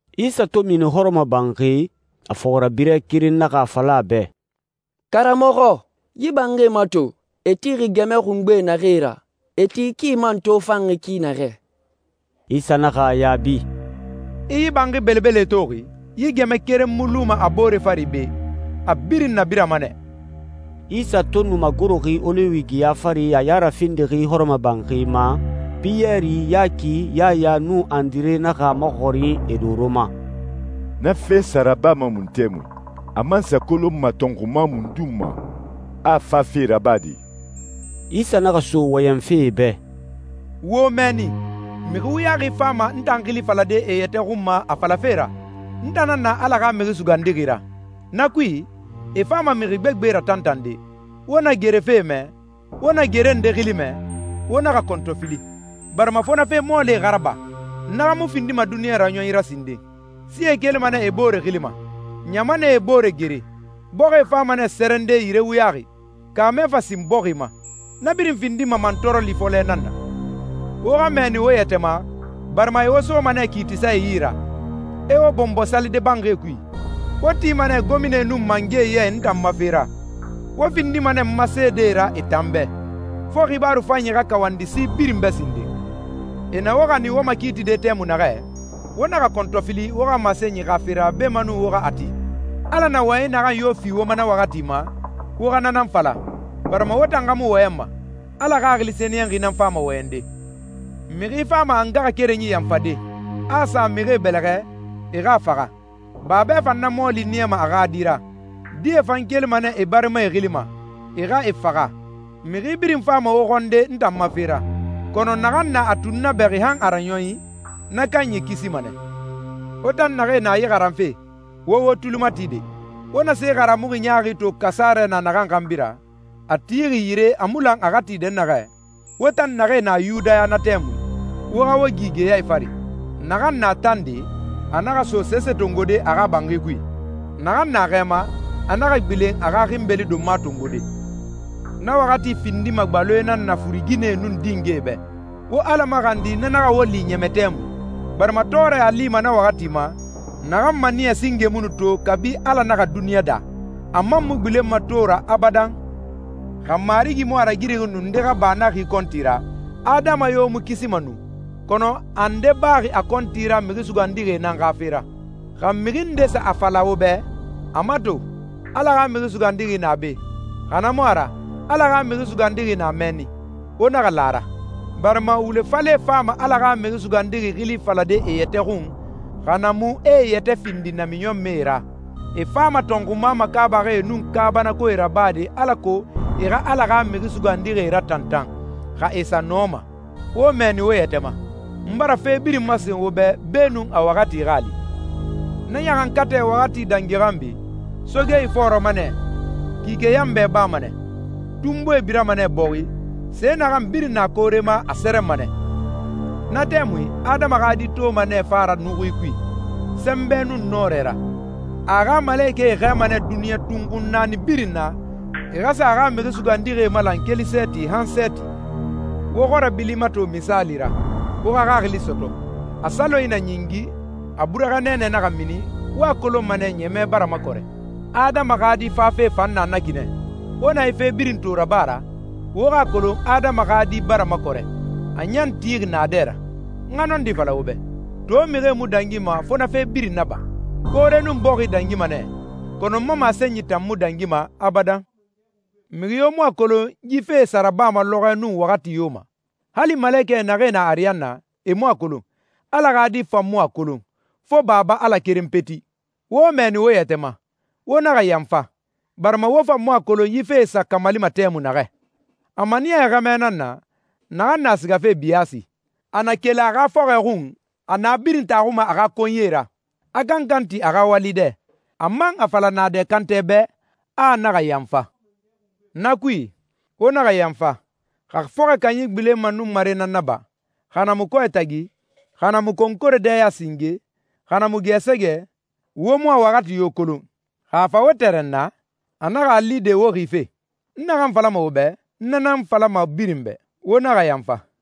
Isa to mini hɔrɔmɔbanxi, a fɔxirabirɛ keren naxa a fala a bɛ, «Karamɔxɔ, yi banxie mato, e tixi gɛmɛ xungbe naxee ra, e ti ki man tofanxi ki naxɛ!» Isa naxa a yaabi, «I yi banxi belebelee toxi? Yi gɛmɛ keren mu luma a boore fari be, a birin nabirama nɛ.» Isa to nu magoroxi Oliwi geya fari, a ya rafindixi hɔrɔmɔbanxi ma, Piyɛri, Yaki, Yaya, nun Andire naxa a maxɔrin e doro ma, «Na fe sa rabama mun tɛmui? A man sa kolonma tɔnxuma mundun ma a a fafe rabade?» Isa naxa so wɔyɛnfe e bɛ, «Wo wo mɛɛni. Mixi wuyaxi fama n tan xili falade e yɛtɛ xun ma a falafe ra, ‹N tan nan na Ala xa Mixi Sugandixi ra!› Na kui, e fama mixi gbegbe ratantande. Wo na gere fe mɛ, wo na gere nde xili mɛ, wo naxa kɔntɔfili, barima fo na fe mɔɔlie xa raba. Na xa mu findima duniɲa raɲɔnyi ra sinden. Sie kelima nɛ e boore xili ma, ɲamanɛe e boore gere. Bɔxi fama nɛ sɛrɛnde yire wuyaxi, kaamɛ fan sin bɔxi ma. Na birin findima mantɔɔrɔli fɔlɛ nan na.» «Wo xa mɛɛni wo yɛtɛ ma, barima e wo soma nɛ kiitisae yi ra, e wo bɔnbɔ salide banxie kui. Wo tima nɛ gominae nun mangɛe ya i n tan ma fe ra, wo findima nɛ n ma seedee ra e tan bɛ. Fo xibaaru fanyi xa kawandi si birin bɛ sinden. E na wo xanin wo makiitide tɛmui naxɛ, wo naxa kɔntɔfili wo xa masenyi xa fe ra beenun wo xa a ti. Ala na wɔyɛnyi naxan yo fi wo ma na waxati ma, wo xa na nan fala, barima wo tan xa mu wɔyɛnma, Ala Xaxili Sɛniyɛnxi nan fama wɔyɛnde.» «Mixi fama a ngaxakerenyi yanfade, a a sa mixie bɛlɛxɛ, e xa a faxa. Babɛ fan na mɔɔli niyama a xa di ra, die fan kelima nɛ e barimae xili ma, e xa e faxa. Mixi birin fama wo xɔnde n tan ma fe ra, kɔnɔ naxan na a tunnabɛxi han a raɲɔnyi, na kanyi kisima nɛ.» «Wo tan naxee na yi xaranfe, wo wo tuli mati de! Wo na se haramuxi ɲaaxi to kasarɛ na naxan xanbi ra, a tixi yire a mu lan a xa ti dɛnnaxɛ, wo tan naxee na Yudaya na tɛmui, wo xa wo gi geyae fari. Naxan na tande, a naxa so sese tongode a xa banxi kui. Naxan na xɛ ma, a naxa gbilen a xa xinbeli donma tongode. Na waxati findima gbaloe nan na furuginɛe nun dingɛe bɛ! Wo Ala maxandi na naxa wo li ɲɛmɛ tɛmui! Barima tɔɔrɛ a lima na waxati ma, naxan maniyɛ singe mu nu to kabi Ala naxa duniɲa daa, a man mu gbilenma to ra abadan. Xa Marigi mu a ragirixi nu nde xa ba na xi kɔnti ra, adama yo mu kisima nu. Kɔnɔ a nde baxi a kɔnti ra mixi sugandixie nan xa fe ra.» «Xa mixi nde sa a fala wo bɛ, ‹A mato, Ala xa Mixi Sugandixi na be›, xa na mu a ra, ‹Ala xa Mixi Sugandixi na mɛnni,› wo naxa la a ra. Barima wule falɛe fama Ala xa Mixi Sugandixi xili falade e yɛtɛ xun, xa na mu e e yɛtɛ findi namiɲɔnmɛe ra. E fama tɔnxuma makaabaxie nun kaabanakoe rabade alako e xa Ala xa mixi sugandixie ratantan, xa e sa nɔma. Wo mɛɛni wo yɛtɛ ma. N bara fe birin masen wo bɛ beenun a waxati xa a li.» «Na ɲaxankatɛ waxati dangi xanbi, ‹soge ifɔɔrɔma nɛ, kike yanbɛ bama nɛ, tunbuie birama nɛ bɔxi, se naxan birin na koore ma a sɛrɛnma nɛ.›» «Na tɛmui Adama xa Di toma nɛ fa ra nuxui kui, sɛnbɛ nun nɔrɛ ra. A a xa malekɛe xɛɛma nɛ duniɲa tunxun naani birin na, e xa sa a xa mixi sugandixie malan keli sɛɛti han sɛɛti.» «Wo xɔrɛ bili mato misaali ra, wo xa xaxili sɔtɔ. A salonyi na ɲingi, a burɛxɛ nɛɛnɛ naxa mini, wo a kolonma nɛ ɲɛmɛ bara makɔrɛ. Adama xa Di fafe fan na na ki nɛ. Wo na yi fe birin to raba ra, wo xa a kolon Adama xa Di bara makɔrɛ, a ɲan tixi naadɛ ra. N xa nɔndi fala wo bɛ, to mixie mu dangima fo na fe birin naba. Koore nun bɔxi dangima nɛ, kɔnɔ n ma masenyi tan mu dangima abadan.» «Mixi yo mu a kolon yi fee sa rabama lɔxɔɛ nun waxati yo ma. Hali malekɛ naxee na ariyanna, e mu a kolon, Ala xa Di fan mu a kolon, fo Baba Ala keren peti. Wo mɛɛni wo yɛtɛ ma, wo naxa yanfa, barima wo fan mu a kolon yi fee sa kamalima tɛmui naxɛ.» «A maniyaxi xɛmɛ nan na, naxan na sigafe biyaasi. A na keli a xa fɔxɔɛ xun, a na birin taxuma a xa konyie ra, a kankan ti a xa wali dɛ, a man a fala naadɛ kantɛ bɛ, a a naxa yanfa. Na kui, wo naxa yanfa. Xa fɔxɔɛ kanyi gbilenma nunmare nan na ba, xa na mu kɔɛ tagi, xa na mu konkore dɛya singe, xa na mu gɛɛsɛgɛ, wo mu a waxati yo kolon. Xa a fa wo tɛrɛnna, a naxa a li de wo xife! N naxan falama wo bɛ, n na nan a falama birin bɛ: Wo naxa yanfa!»